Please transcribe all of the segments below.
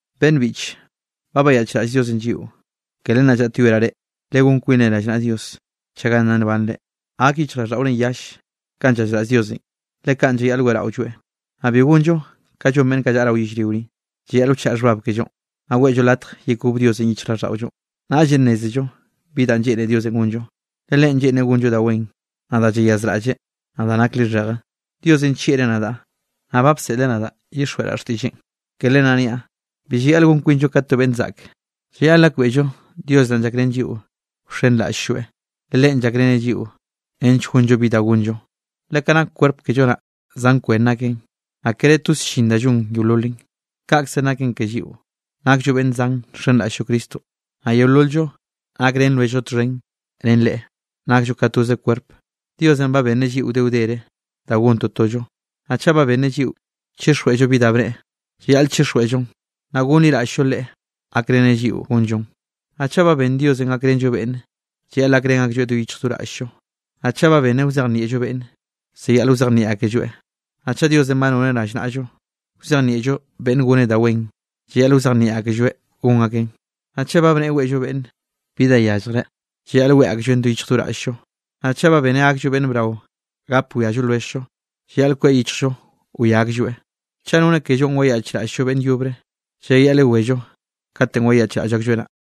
Beꞌnn biꞌche, ba bayaꞌchraꞌll Diosenꞌ lliꞌo, ke len naꞌ llaꞌtyoeraꞌ reꞌ, legón kwinre rallnaꞌa Dios chaga nna nbanre. Gak yichjraꞌlldaꞌorenꞌ yall kanꞌ llazraꞌll Diosenꞌ. Le kaꞌn llayaꞌl weꞌraolloeꞌ. Naꞌ bi gonllo kanꞌ llon beꞌnn kaꞌ llaꞌa rao yellrio ni. Llayaꞌl wchaꞌa xhbab kellonꞌ, naꞌ weꞌllo latj yekob Diosenꞌ yichjraꞌlldaꞌollonꞌ, naꞌllenꞌ nnézello bi danꞌ lleꞌne Diosenꞌ gonllo. Le Leꞌen lleꞌnreꞌ gonllo da wen, naꞌ da llayazraꞌlleꞌ, naꞌ da nak lixheje. Diosenꞌ nllieꞌreꞌ nadaꞌ, naꞌ ba bseꞌleꞌ nadaꞌ llyixjweꞌraꞌ xtiꞌlleꞌn. Ke len naꞌ niaꞌ, bi llayaꞌl gon kwinllo ka to beꞌnn zaꞌk, llayaꞌl gakbeꞌllo Dios naꞌn llakrén lliꞌo wxenraꞌll-lloeꞌ, le Leꞌen llakreneꞌ lliꞌo nench gonllo bi da gonllo. Le kaꞌn nak kwerp kello naꞌ, zan kwen naken, naꞌ kere toze llin da llon yeololen. Kaꞌkzenꞌ naken ke lliꞌo, nakllo beꞌnn zan nxenraꞌll-llo Cristonꞌ, naꞌ yeolol-llo nakrén lwelljllo txhen ren Leꞌe, nakllo ka toze kwerp. Diosenꞌ ba benneꞌ lliꞌo wde wdere da gon totollo. Naꞌ chaꞌ ba benneꞌ lliꞌo chixjweꞌllo bi da bneꞌe, llayaꞌl chixjweꞌllon, naꞌ gonliraꞌll-llo Leꞌe gakreneꞌ lliꞌo gonllon. Naꞌ chaꞌ ba benn Diosenꞌ gakrenllo beꞌnne, llayaꞌl gakrén aklloeꞌ do yichj do raꞌll-llo. Naꞌ chaꞌ ba benneꞌ wzejnieꞌllo beꞌnne, llayaꞌl wzejnieꞌ akelloeꞌ. Naꞌ chaꞌ Diosenꞌ ba noneꞌ rallnaꞌllo wzejnieꞌllo beꞌnne goneꞌ da wen, llayaꞌl wzejnieꞌ akelloeꞌ gon akeꞌn. Naꞌ chaꞌ ba bneꞌe weꞌllo beꞌnne bi da yalljreꞌ, llayaꞌl weꞌe aklloeꞌn do yichj do raꞌll-llo. Naꞌ chaꞌ ba benneꞌ gakllo beꞌnn brao gap wiallo lwelljllo, llayaꞌl kweꞌ yichjllo wia aklloeꞌ. Chaꞌ nonneꞌ kellonꞌ wayaꞌchraꞌll-llo beꞌnn yobre, llayaꞌl yewello katenꞌ wayaꞌchraꞌll aklloeꞌ naꞌ.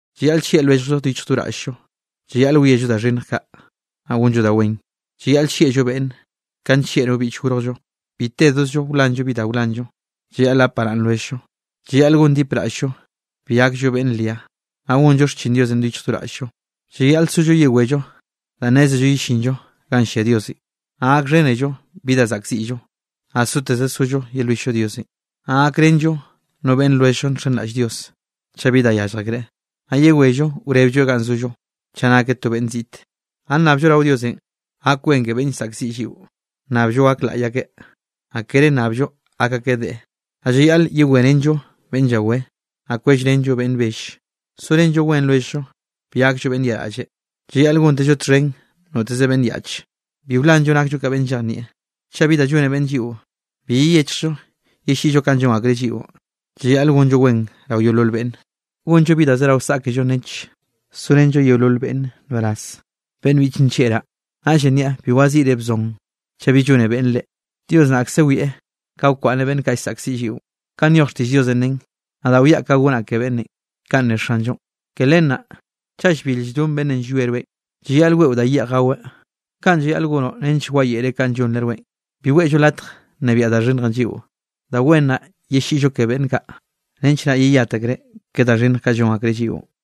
Llayaꞌl llieꞌ lwelljllo do yichj do raꞌll-llo, llayaꞌl wiello da xhinnj kaꞌ, naꞌ gonllo da wen. Llayaꞌl llieꞌllo beꞌnne, kanꞌ nllieꞌ no biꞌch gorjllo. Bi tedozllo wlanllo bi da wlanllo, llayaꞌl gap baraꞌnn lwelljllo. Llayaꞌl gondipraꞌll-llo bi gakllo beꞌnn ria, naꞌ gonllo xchin Diosenꞌ do yichj do raꞌll-llo. Llayaꞌl sollo yewello danꞌ nnézello yellinllo ganꞌ llia Diosenꞌ, naꞌ gakxhénello bi da zaꞌkziꞌllo, naꞌ soteze sollo yelwill-llo Diosenꞌ. Naꞌ gakrenllo no beꞌnn lwelljllo nxenraꞌll Dios, chaꞌ bi da yallj akreꞌ, naꞌ yewello wreblloeꞌ ga zollo, chaꞌ nakeꞌ no beꞌnn ziꞌte. Naꞌ nnabllo rao Diosenꞌ gak wen ke beꞌnn llsaꞌkziꞌ lliꞌo. Nnabllo gak laꞌy akeꞌ, naꞌ kere nnabllo gak akeꞌ deꞌe. Naꞌ llayaꞌl yewerénello beꞌnn llawé, naꞌ kwellrenllo beꞌnn bell. Sorenllo wen lwelljllo, bi gakllo beꞌnn yaꞌraꞌlle, llayaꞌl gontezllo txhen noteze beꞌnn yaꞌche, bi wlanllo nakllo ka beꞌnn llejnieꞌ. Chaꞌ bi da llone beꞌnne lliꞌo, bi yeyechjllo yelliꞌllo kanꞌ llon akreꞌ lliꞌon. Llayaꞌl gonllo wen rao yeolol beꞌnne. Gonllo bi da zerao saꞌkello nench sorenllo yeolol beꞌnne nbaraz. Beꞌnn biꞌche nllieꞌraꞌ reꞌ, naꞌllenꞌ niaꞌ bi waziꞌre wzon chaꞌ bi llone beꞌnne reꞌ. Dios naꞌkze wieꞌ ka wkwaꞌnneꞌ beꞌnn kaꞌ llsaꞌkziꞌ lliꞌon, kanꞌ nyoj xtiꞌll Diosenꞌ nen: “Nadaꞌ wiaꞌ ka gonaꞌ ke beꞌnnenꞌ.” Kaꞌn ne Xanllonꞌ. Ke len naꞌ: “Chaꞌ llbil lldon beꞌnn llwie rweꞌ, llayaꞌl weꞌo da yeꞌj gaweꞌ; kaꞌn llayaꞌl gonoꞌ nench wayeꞌreꞌ kanꞌ llonreꞌ rweꞌn.” Bi weꞌllo latj nnebiaꞌ da xhinnjenꞌ lliꞌo, da wen naꞌ yelliꞌllo ke beꞌnn kaꞌ, nench naꞌ yeyat akreꞌ ke da xhinnj kaꞌ llon akreꞌ lliꞌon.